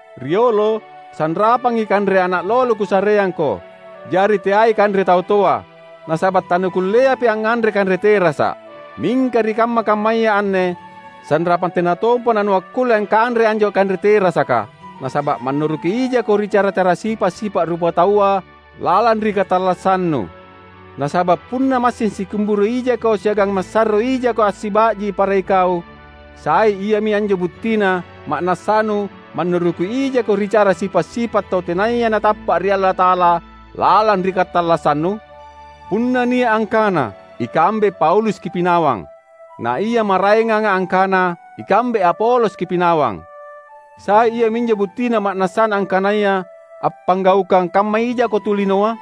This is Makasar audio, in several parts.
Riolo sanrapangi kanre ana’ lolo kusareangko, jari teai kanre tau toa; nasaba’ tanukulleapi angnganre kanre terasa’. Mingka ri kamma-kammaya anne sanrapang tena tompa nanuakkulle angkanrei anjo kanre terasaka, nasaba’ mannuruki ijako ri cara sipa’-sipa’ rupataua lalang ri katallassannu. Nasaba’ punna massing sikimburu ijako siagang masarro ijako assiba’ji para ikau, sai iami anjo buttina ma’nassanu mannuruki ijako ri cara sipa’-sipa’ tau tenaya natappa’ ri Allata’ala lalang ri katallassannu? Punna nia’ angkana, "Ikambe Paulus kipinawang," na ia maraenganga angkana, "Ikambe Apolos kipinawang," sai iaminjo buttina ma’nassana angkanaya appanggaukang kamma ijako tu linoa?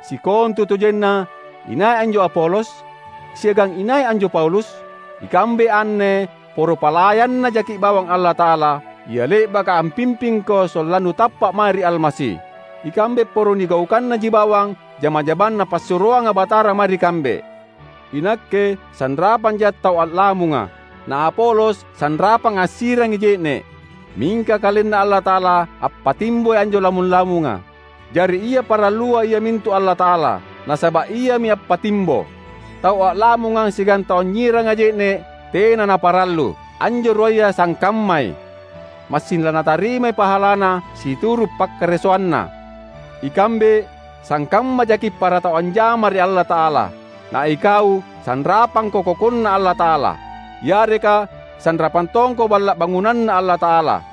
Sikontutojenna inai anjo Apolos? Siagang inai anjo Paulus? Ikambe anne poro palayanNa jaki’ bawang Allata’ala, ia le’baka ampimpingko sollannu tappa’ mae ri Almasi. Ikambe poro nigaukannaji bawang jama-jamang Napassuroanga Batara mae ri kambe. Inakke sanrapanja’ tau a’lamunga, na Apolos sanrapang ansirangi je’ne’, mingka KalenNa Allata’ala ampattimboi anjo lamung-lamunga. Jari ia parallua iamintu Allata’ala, nasaba’ Iami appattimbo. Tau a’lamunga siagang tau anynyiranga je’ne’ tena naparallu; anjo ruaya sangkammai. Massing lanatarimai pahalana situru’ pakkaresoanna. Ikambe sangkamma jaki’ para tau anjama ri Allata’ala; na ikau sanrapangko kokonNa Allata’ala. Yareka sanrapang tongko balla’ bangunanNa Allata’ala.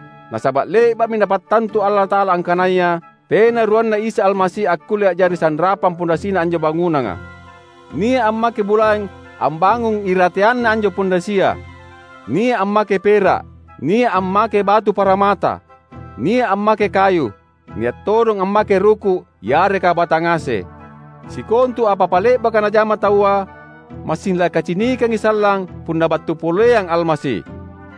Nasaba’ le’ba’mi Napattantu Allata’ala angkanaya tena ruanna Isa Almasi akkulle a’jari sanrapang pondasina anjo bangunanga. Nia’ ammake bulaeng ambangung irateanna anjo pondasia, nia’ ammake pera’, nia’ ammake batu paramata, nia’ ammake kayu, nia’ todong ammake ruku’ yareka batang ase. Sikontu apa-apa le’baka najama taua, massing lakacinikangi sallang punna battu poleang Almasi.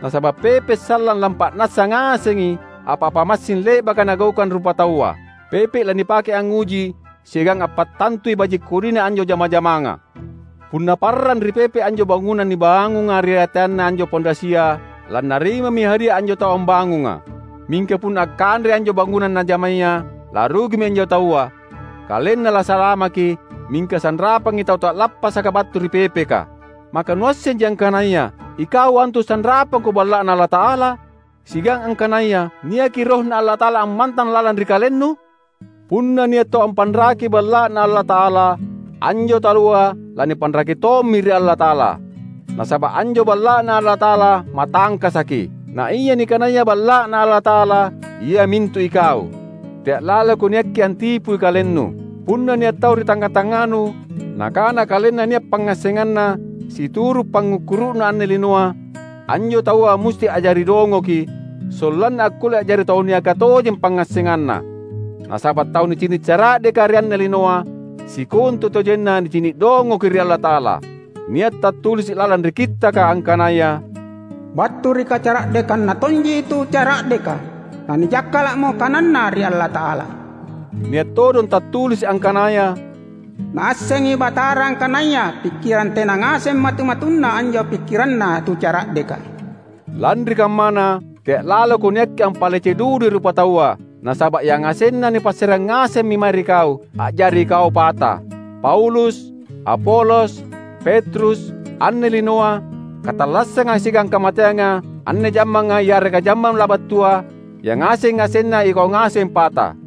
Nasaba’ pepe’ sallang lampa’nassa ngasengi apa-apa massing le’baka nagaukang rupataua. Pepe’ lanipake angnguji siagang ampattantui baji’-kodina anjo jama-jamanga. Punna parrang ri pepe’ anjo bangunang nibangunga irateanna anjo pondasia, lannarimami hadia anjo tau ambangunga. Mingka punna akkanrei anjo bangunang najamaya, larugimi anjo taua; kalenna lasalamaki, mingka sanrapangi tau ta’lappasaka battu ri pepeka. Maka nuassenji angkanaya ikau antu sanrapangko balla’Na Allata’ala? Siagang angkanaya niaki RohNa Allata’ala ammantang lalang ri kalennu? Punna nia’ tau ampanraki balla’Na Allata’ala, anjo taua lanipanraki tommi ri Allata’ala. Nasaba’ anjo balla’Na Allata’ala matangkasaki, naia nikanaya balla’Na Allata’ala iamintu ikau. Tea’ laloko niakki antipui kalennu. Punna nia’ tau ri tangnga-tangnganu nakana kalenna nia’ pangngassenganna situru’ pangngukkuru’na anne linoa, anjo taua musti a’jari dongoki, sollanna akkulle a’jari tau niaka tojeng pangngassenganna. Nasaba’ tau nicini’ cara’deka ri anne linoa, sikontutojenna nicini’ dongoki ri Allata’ala. Nia’ tattulisi’ lalang ri Kittaka angkanaya, "Battu ri kacara’dekanna tonji tu cara’deka, nanijakkala’mo kananna ri Allata’ala." Nia’ todong tattulisi’ angkanaya, "Naassengi Batara angkanaya pikkirang tena ngaseng matu-matunna anjo pikkiranna tu cara’deka." Lanri kammana, tea’ laloko niakki ampalece dudui rupataua, nasaba’ yangasenna nipassareang ngasemmi mae ri kau, a’jari ikau pata: Paulus, Apolos, Petrus, anne linoa, katallassanga siagang kamateanga, anne jammanga yareka jammang labattua, yangaseng-ngasenna ikau ngaseng pata.